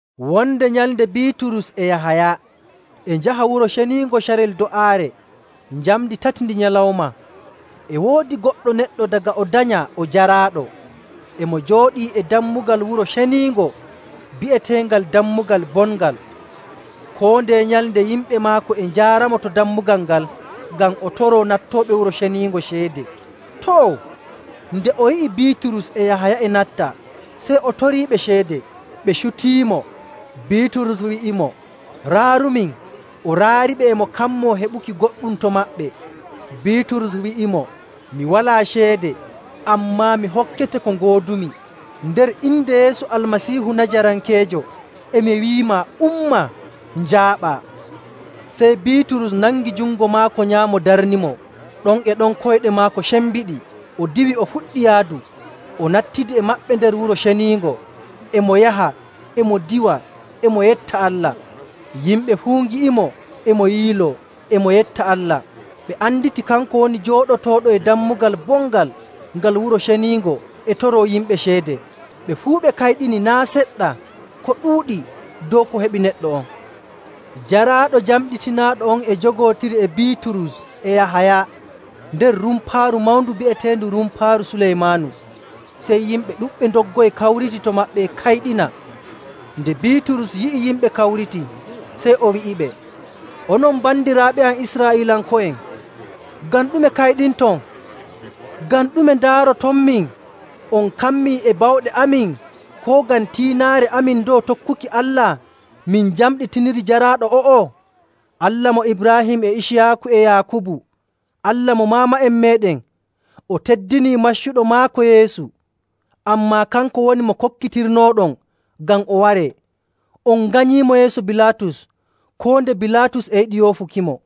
Wonde nyalnde Biiturus e Yahaya e njaha Wuro Ceniingo carel do'aare, njamndi tati ndi nyalawma. E woodi goɗɗo neɗɗo daga o danyaa o jaraaɗo, e mo jooɗii e dammugal Wuro Ceniingo bi'eteengal Dammugal Bongal. Koo ndeye nyalnde yimɓe maako e njaaramo to dammugal ngal ngam o toroo nattooɓe Wuro Ceniingo ceede. Too, nde o yi'i Biiturus e Yahaya e natta, sey o toriiɓe ceede. Ɓe cutiimo, Biiturus wi'imo, “Raarumin!” O raariɓe e mo kammoo heɓuki goɗɗum to maɓɓe. Biiturus wi'imo, “Mi walaa ceede, ammaa mi hokkete ko ngoodumi. Nder inde Yeesu Almasiihu Najarankeejo, e mi wi'imaa, umma, njaaɓaa!” Sey Biiturus nangi jungo maako nyaamo darnimo. Ɗon e ɗon koyɗe maako cembiɗi. O diwi o fuɗɗi yaadu. O nattidi e maɓɓe nder Wuro Ceniingo. E mo yaha, e mo diwa, e mo yetta Allah. Yimɓe fuu ngi'imo e mo yiiloo, e mo yetta Allah. Ɓe anditii kanko woni jooɗotooɗo e Dammugal Bongal ngal Wuro Ceniingo e toroo yimɓe ceede. Ɓe fuu ɓe kayɗini naa' seɗɗa ko ɗuuɗi dow ko heɓi neɗɗo on. Jaraaɗo jamɗitinaaɗo on e jogootiri e Biiturus e Yahaya nder rumpaaru mawndu bi'eteendu Rumpaaru Suleymaanu, sey yimɓe ɗuɗɓe ndoggoyi kawriti to maɓɓe e kayɗina. Nde Biiturus yi'i yimɓe kawritii, sey o wi'iɓe, “Onon bandiraaɓe am Israa'iilanko'en, ngam ɗume kayɗinton? Ngam ɗume ndaarotonmin? On kammii e bawɗe amin koo ngam tiinaare: Waato kookari (H) amin dow tokkuki Allah min njamɗitiniri jaraaɗo o'o? Allah mo Ibraahim e Iciyaaku e Yaakubu, Allah mo maama'en meeɗen, o teddinii maccuɗo maako Yeesu. Ammaa kanko woni mo kokkitirnooɗon ngam o waree. On nganyiimo yeeso Bilaatus koo nde Bilaatus e yiɗi yoofukimo..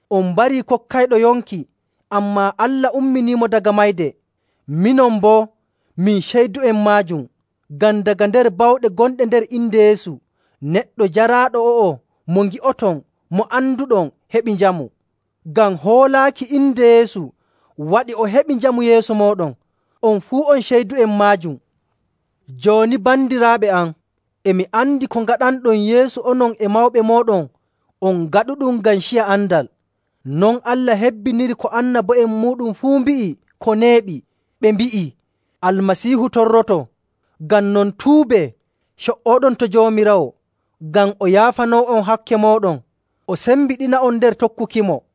On mbarii kokkayɗo yonki, ammaa Allah umminiimo daga mayde. Minon boo, min ceydu'en maajum. Ngam daga nder bawɗe gonɗe nder inde Yeesu, neɗɗo jaraaɗo o'o mo ngi'oton mo anduɗon heɓi njamu. Ngam hoolaaki inde Yeesu waɗi o heɓi njamu yeeso mooɗon, on fuu on ceydu'en maajum. “Jooni bandiraaɓe am, e mi andi ko ngaɗanɗon Yeesu onon e mawɓe mooɗon on ngaɗuɗum ngam ciya andal. Non Allah hebbiniri ko annabo'en muuɗum fuu mbi'i ko neeɓi, ɓe mbi'ii Almasiihu torroto. Ngam non, tuubee, co''ooɗon to Joomiraawo ngam o yaafanoo'on hakke mooɗon, o sembiɗina'on nder tokkukimo,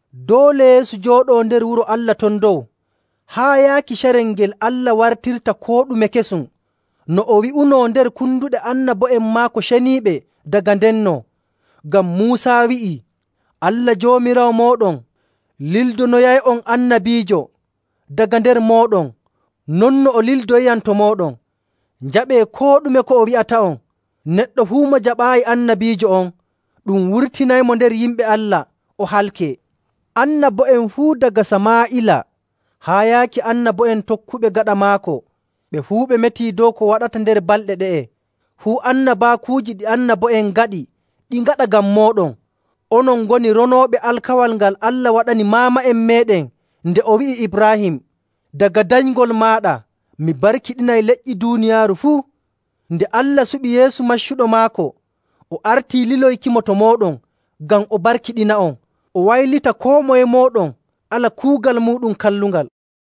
Doole Yeesu jooɗoo nder wuro Allah ton dow haa yaaki carel ngel Allah wartirta koo ɗume kesum, no o wi'unoo nder konduɗe annabo'en maako ceniiɓe daga ndenno. Ngam Muusa wi'ii, ‘Allah Joomiraawo mooɗon lildonoyay'on annabiijo daga nder mooɗon non no o lildoyiyam to mooɗon. Njaɓee koo ɗume ko o wi'ata'on.. Neɗɗo fuu mo jaɓaayi annabiijo on, ɗum wurtinaymo nder yimɓe Allah o halkee.’. Annabo'en fuu daga Samaa'ila haa yaaki annabo'en tokkuɓe gaɗa maako, ɓe fuu ɓe metii dow ko waɗata nder balɗe ɗe'e. Fuu annabaakuuji ɗi annabo'en ngaɗi ɗi ngaɗa ngam mooɗon. Onon ngoni ronooɓe alkawal ngal Allah waɗani maama'en meeɗen nde o wi'i Ibraahim, ‘Daga danyngol maaɗa mi barkiɗinay leƴƴi duuniyaaru fuu.’. Nde Allah suɓi Yeesu maccuɗo maako, o artii liloykimo to mooɗon ngam o barkiɗina'on, o waylita koo moye mooɗon ala kuugal muuɗum kallungal.”